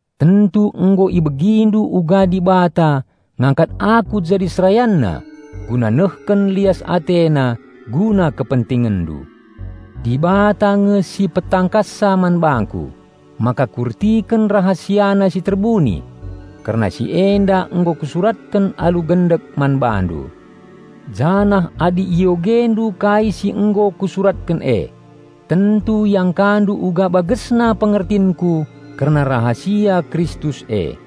Tentu nggo ibegindu uga Dibata ngangkat aku jadi SerayanNa guna nehken lias AteNa guna kepentingenndu. Dibata nge si petangkassa man bangku maka kuertiken RahasiaNa si terbuni. Kerna si enda nggo kusuratken alu gendek man bandu, janah adi iogendu kai si nggo kusuratken e, tentu iangkandu uga bagesna pengertinku kerna rahasia Kristus e.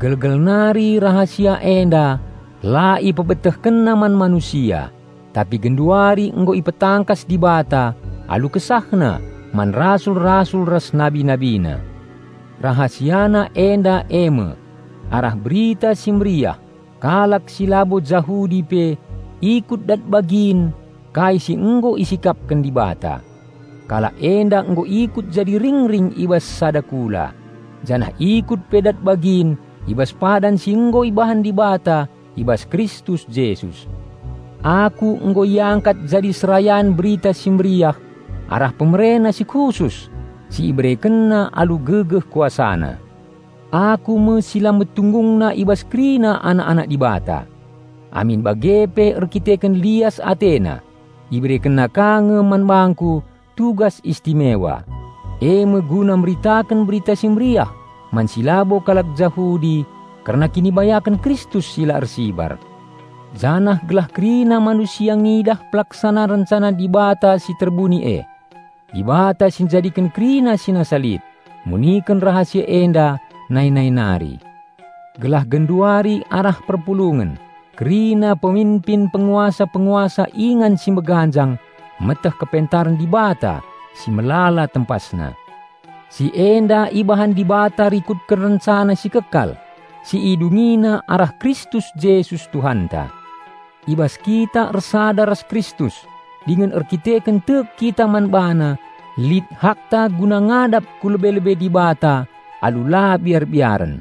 Gelgel nari rahasia enda la IpebetehkenNa man manusia, tapi genduari nggo ipetangkas Dibata alu KesahNa man rasul-rasul ras Nabi NabiNa. RahasiaNa enda eme: Arah Berita Si Mehuli, kalak si labo Jahudi pe ikut dat bagin kai si nggo isikapken Dibata. Kalak enda nggo ikut jadi ring-ring i bas sada kula, janah ikut pe dat bagin i bas padan si nggo ibahan Dibata i bas Kristus Jesus. Aku nggo iangkat jadi serayan Berita Si Mehuli arah PemereNa si khusus, si IberekenNa alu gegeh KuasaNa. Aku me si la metunggungna i bas kerina anak-anak Dibata. Amin bage pe erkiteken lias AteNa IberekenNa ka nge man bangku tugas istimewa, eme guna meritaken Berita Si Mehuli man si labo kalak Jahudi kerna kinibayaken Kristus si la ersibar. Janah gelah kerina manusia ngidah pelaksanan rencana Dibata si terbuni e. Dibata si njadiken kerina si nasa lit, muniken rahasia enda nai-nai nari. Gelah genduari arah perpulungen, kerina peminpin penguasa-penguasa ingan si meganjang meteh kepentaren Dibata si melala tempasna. Si enda ibahan Dibata rikutken rencana si kekal, si IdungiNa arah Kristus Jesus Tuhanta. I bas kita ersada ras Kristus dingen erdandanken tek kita man BaNa lit hakta guna ngadap ku lebe-lebe Dibata alu la biar-biaren.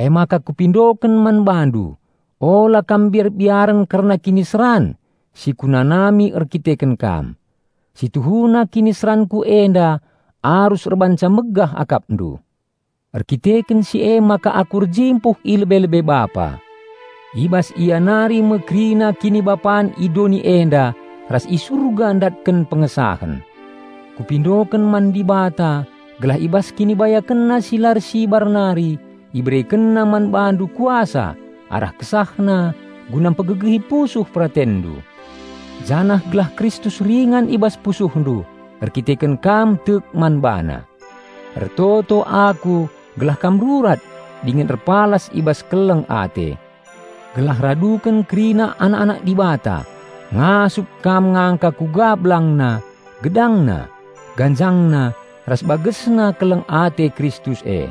Emaka kupindoken man bandu ula kam biar-biaren kerna kiniseran si kunanami erdandanken kam; si tuhuna kiniseranku enda arus erbahanca megah akapndu. Erdandanken si emaka aku erjimpuh i lebe-lebe Bapa. I bas Ia nari me kerina kinibapan i doni enda ras i Surga ndatken pengesahen. Kupindoken man Dibata gelah i bas KinibayakenNa si la ersibar nari IberekenNa man bandu kuasa arah KesahNa guna mpegegehi pusuh peratenndu. Janah gelah Kristus ringan i bas pusuhndu erdandanken kam tek man BaNa. Ertoto aku gelah kam rurat dingen erpalas i bas keleng ate. Gelah raduken kerina anak-anak Dibata ngasup kam ngangka kuga belangna, gedangna, ganjangna ras bagesna keleng ate Kristus e.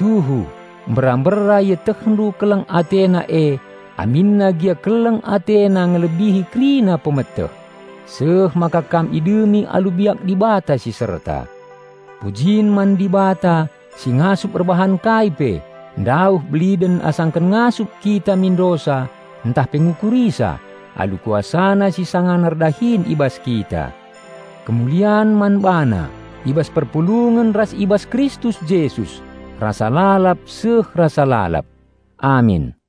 Tuhu, mbera-mbera ietehndu keleng AteNa e aminna gia keleng AteNa ngelebihi kerina pemeteh, seh maka kam idemi alu biak Dibata si serta. Pujin man Dibata si ngasup erbahan kai pe ndauh beliden asangken ngasup kita mindosa ntah pe ngukurisa alu KuasaNa si sangana erdahin i bas kita. Kemulian man BaNa i bas perpulungen ras i bas Kristus Jesus, rasa lalap seh rasa lalap. Amin.